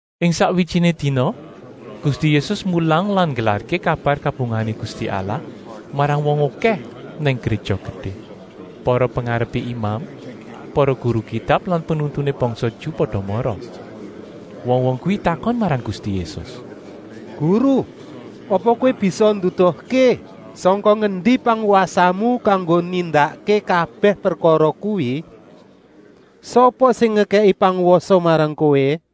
Ing sakwijiné dina Gusti Yésus mulang lan nggelarké kabar kabungahané Gusti Allah marang wong okèh nang Gréja Gedé. Para pengarepé imam, para guru Kitab lan penuntuné bangsa Ju pada mara. Wong-wong kuwi takon marang Gusti Yésus: “Guru, apa Kowé bisa nduduhké sangka ngendi pangwasamu kanggo nindakké kabèh prekara kuwi? Sapa sing ngekèki pangwasa marang Kowé?”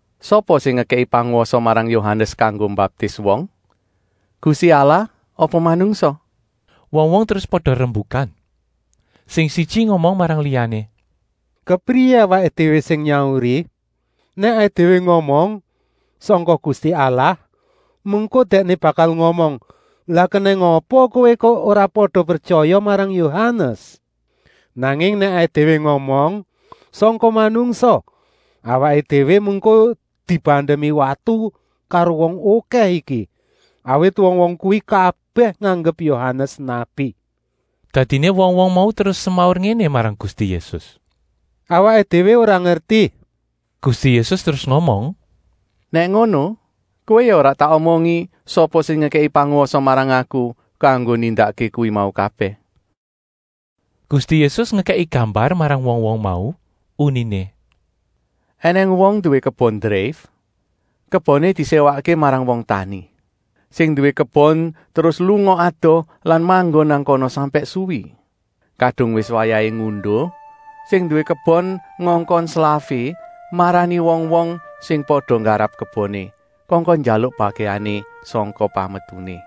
Sapa sing ngekèki pangwasa marang Yohanes kanggo mbaptis wong? Gusti Allah apa manungsa?” Wong-wong terus pada rembukan. Sing siji ngomong marang liyané: “Kepriyé awaké déwé sing nyauri? Nèk awaké déwé ngomong: ‘Sangka Gusti Allah,’ mengko Dèkné bakal ngomong: ‘Lah kenèng apa kowé kok ora pada pretyaya marang Yohanes?’ Nanging nèk awaké déwé ngomong: ‘Sangka manungsa,’ awaké déwé mengko dibandemi watu karo wong okèh iki, awit wong-wong kuwi kabèh nganggep Yohanes nabi.” Dadiné wong-wong mau terus semaur ngéné marang Gusti Yésus: “Awaké déwé ora ngerti.” Gusti Yésus terus ngomong: “Nèk ngono kowé ya ora tak omongi sapa sing ngekèki pangwasa marang Aku kanggo nindakké kuwi mau kabèh.” Gusti Yésus ngekèki gambar marang wong-wong mau, uniné: “Enèng wong nduwé kebon dreif. Keboné diséwakké marang wong tani. Sing nduwé kebon terus lunga adoh lan manggon nang kana sampèk suwi. Kadung wis wayahé ngunduh, sing nduwé kebon ngongkon slafé marani wong-wong sing pada nggarap keboné, kongkon njaluk bagèané sangka pametuné.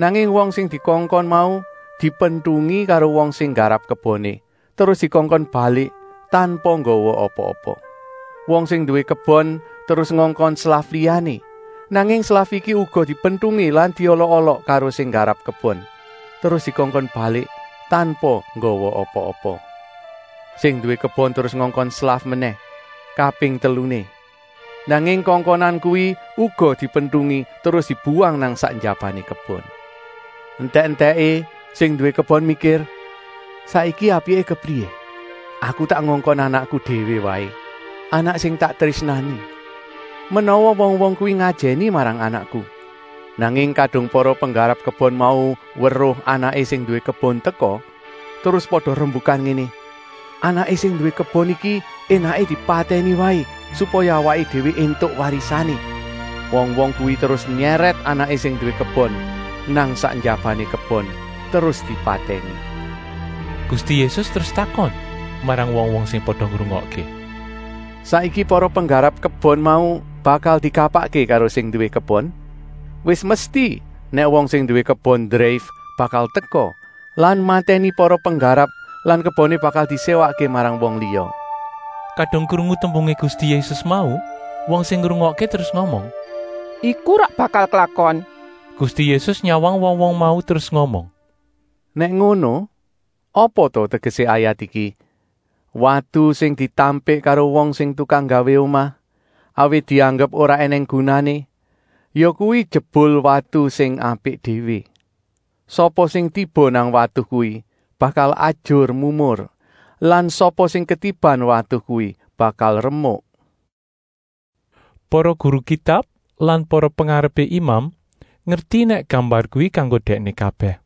Nanging wong sing dikongkon mau dipentungi karo wong sing nggarap keboné, terus dikongkon balik tanpa nggawa apa-apa. Wong sing nduwé kebon terus ngongkon slaf liyané, nanging slaf iki uga dipentungi lan diolok-olok karo sing nggarap kebon, terus dikongkon balik tanpa nggawa apa-apa. Sing nduwé kebon terus ngongkon slaf menèh, kaping teluné. Nanging kongkonan kuwi uga dipentungi terus dibuwang nang sak njabané kebon. Entèk-entèké sing nduwé kebon mikir: ‘Saiki apiké kepriyé? Aku tak ngongkon anakku déwé waé, anak sing tak trésnani. Menawa wong-wong kuwi ngajèni marang anakku.’ Nanging kadung para penggarap kebon mau weruh anaké sing nduwé kebon teka, terus pada rembukan ngéné: ‘Anaké sing nduwé kebon iki énaké dipatèni waé supaya awaké déwé éntuk warisané.’ Wong-wong kuwi terus nyèrèt anaké sing nduwé kebon nang sak njabané kebon terus dipatèni.” Gusti Yésus terus takon marang wong-wong sing pada ngrungokké: “Saiki para penggarap kebon mau bakal dikapakké karo sing nduwé kebon? Wis mesti nèk wong sing nduwé kebon dreif bakal teka lan matèni para penggarap lan keboné bakal diséwakké marang wong liya.” Kadung krungu tembungé Gusti Yésus mau, wong sing ngrungokké terus ngomong: “Iku ora bakal klakon!” Gusti Yésus nyawang wong-wong mau terus ngomong: “Nèk ngono, apa ta tegesé ayat iki: ‘Watu sing ditampik karo wong sing tukang nggawé omah, awit dianggep ora ènèng gunané, yakuwi jebul watu sing apik déwé.’ Sapa sing tiba nang watu kuwi bakal ajur-mumur lan sapa sing ketiban watu kuwi bakal remuk.” Para guru Kitab lan para pengarepé imam ngerti nèk gambar kuwi kanggo dèkné kabèh,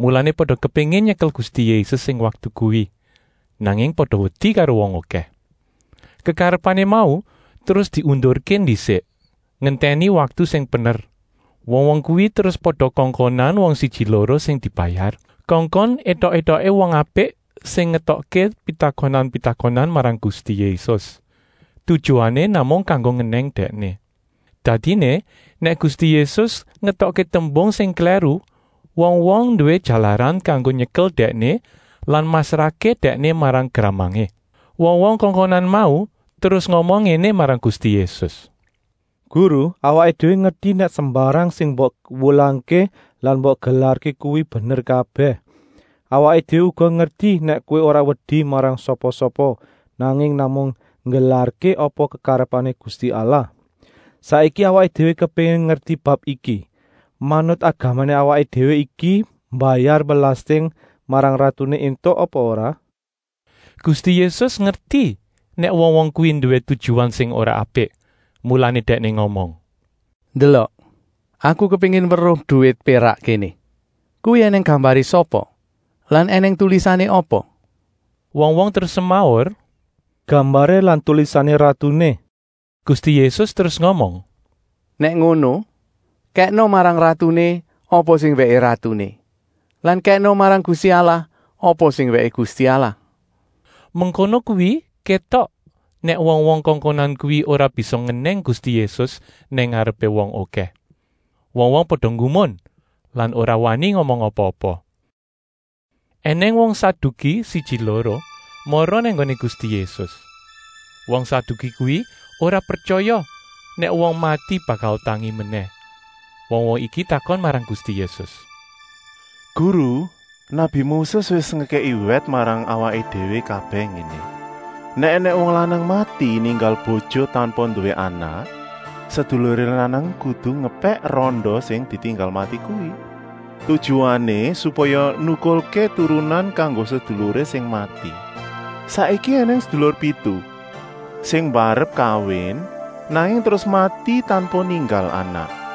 mulané pada kepéngin nyekel Gusti Yésus ing waktu kuwi, nanging pada wedi karo wong okèh. Kekarepané mau terus diundurké ndisik, ngentèni waktu sing pener. Wong-wong kuwi terus pada kongkonan wong siji-loro sing dibayar, kongkon étok-étoké wong apik sing ngetokké pitakonan-pitakonan marang Gusti Yésus, tujuané namung kanggo ngenèng Dèkné. Dadiné nèk Gusti Yésus ngetokké tembung sing klèru, wong-wong nduwé jalaran kanggo nyekel Dèkné lan masrahké Dèkné marang gramangé. Wong-wong kongkonan mau terus ngomong ngéné marang Gusti Yésus: “Guru, awaké déwé ngerti nèk sembarang sing mbok wulangké lan mbok gelarké kuwi bener kabèh. Awaké déwé uga ngerti nèk Kowé ora wedi marang sapa-sapa, nanging namung nggelarké apa kekarepané Gusti Allah. Saiki awaké déwé kepéngin ngerti bab iki: manut agamané awaké déwé iki mbayar belasting marang ratuné éntuk apa ora?” Gusti Yésus ngerti nèk wong-wong kuwi nduwé tujuan sing ora apik, mulané Dèkné ngomong: “Ndelok, Aku kepéngin weruh duwit pérak kéné. Kuwi ènèng gambaré sapa lan ènèng tulisané apa?” Wong-wong terus semaur: “Gambaré lan tulisané ratuné!” Gusti Yésus terus ngomong: “Nèk ngono, kèkna marang ratuné apa sing wèké ratuné lan kèkna marang Gusti Allah apa sing wèké Gusti Allah.” Mengkono kuwi kétok nèk wong-wong kongkonan kuwi ora bisa ngenèng Gusti Yésus nang ngarepé wong okèh. Wong-wong pada nggumun lan ora wani ngomong apa-apa. Enèng wong Saduki siji-loro mara nang nggoné Gusti Yésus. Wong Saduki kuwi ora pretyaya nèk wong mati bakal tangi menèh. Wong-wong iki takon marang Gusti Yésus: “Guru, nabi Moses wis ngekèki wèt marang awaké déwé kabèh ngéné: ‘Nèk ènèng wong lanang mati ninggal bojo tanpa nduwé anak, seduluré lanang kudu ngepèk randa sing ditinggal mati kuwi. Tujuané supaya nukulké turunan kanggo seduluré sing mati.’ Saiki ènèng sedulur pitu. Sing mbarep kawin, nanging terus mati tanpa ninggal anak.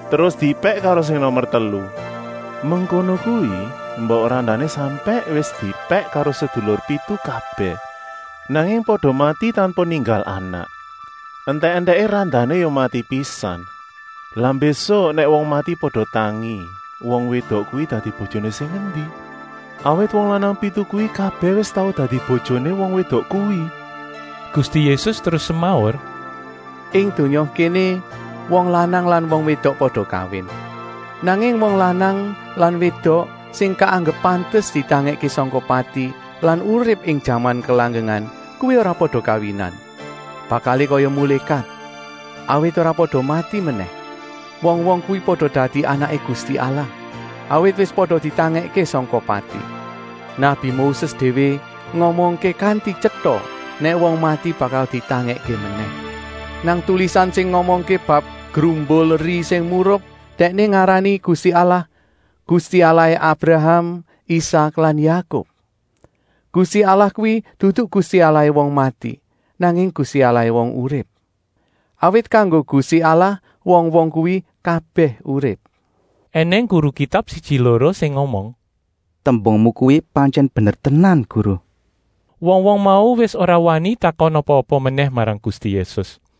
Terus diepèk karo sing nomer telu. Mengkono kuwi mbok randané sampèk wis diepèk karo sedulur pitu kabèh, nanging pada mati tanpa ninggal anak. Entèk-entèké randané ya mati pisan. Lah mbésuk nèk wong mati pada tangi, wong wédok kuwi dadi bojoné sing endi? Awit wong lanang pitu kuwi kabèh wis tau dadi bojoné wong wédok kuwi?” Gusti Yésus terus semaur: “Ing donya kéné wong lanang lan wédok pada kawin. Nanging wong lanang lan wédok sing kaanggep pantes ditangèkké sangka pati lan urip ing jaman kelanggengan kuwi ora pada kawinan. Bakalé kaya mulékat, awit ora pada mati menèh. Wong-wong kuwi pada dadi anaké Gusti Allah, awit wis pada ditangèkké sangka pati. Nabi Moses déwé ngomongké kanti tyeta nèk wong mati bakal ditangèkké menèh. Nang tulisan sing ngomongké bab grumbul eri sing murup dèkné ngarani Gusti Allah: Gusti Allahé Abraham, Isak lan Yakub. Gusti Allah kuwi dudu Gusti Allahé wong mati, nanging Gusti Allahé wong urip. Awit kanggo Gusti Allah wong-wong kuwi kabèh urip.” Enèng guru Kitab siji-loro sing ngomong: “Tembungmu kuwi pantyèn bener tenan, Guru.” Wong-wong mau wis ora wani takon apa-apa menèh marang Gusti Yésus.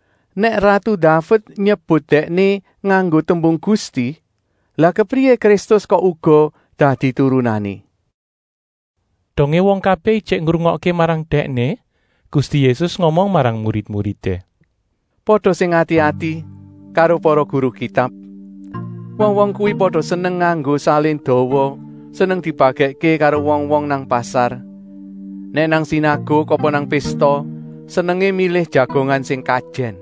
Nèk ratu Daved nyebut Dèkné nganggo tembung Gusti, lah kepriyé Kristus kok uga dadi turunané?” Dongé wong kabèh ijik ngrungokké marang Dèkné, Gusti Yésus ngomong marang murid-muridé: “Pada sing ati-ati karo para guru Kitab. Wong-wong kuwi pada seneng nganggo salin dawa, seneng dibagèkké karo wong-wong nang pasar. Nèk nang sinaguk apa nang pésta senengé milih jagongan sing kajèn.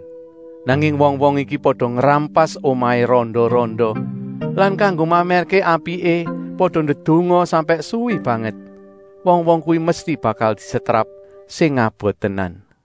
Nanging wong-wong iki pada ngrampas omahé randa-randa lan kanggo mamèrké apiké pada ndedonga sampèk suwi banget. Wong-wong kuwi mesti bakal disetrap sing abot tenan.”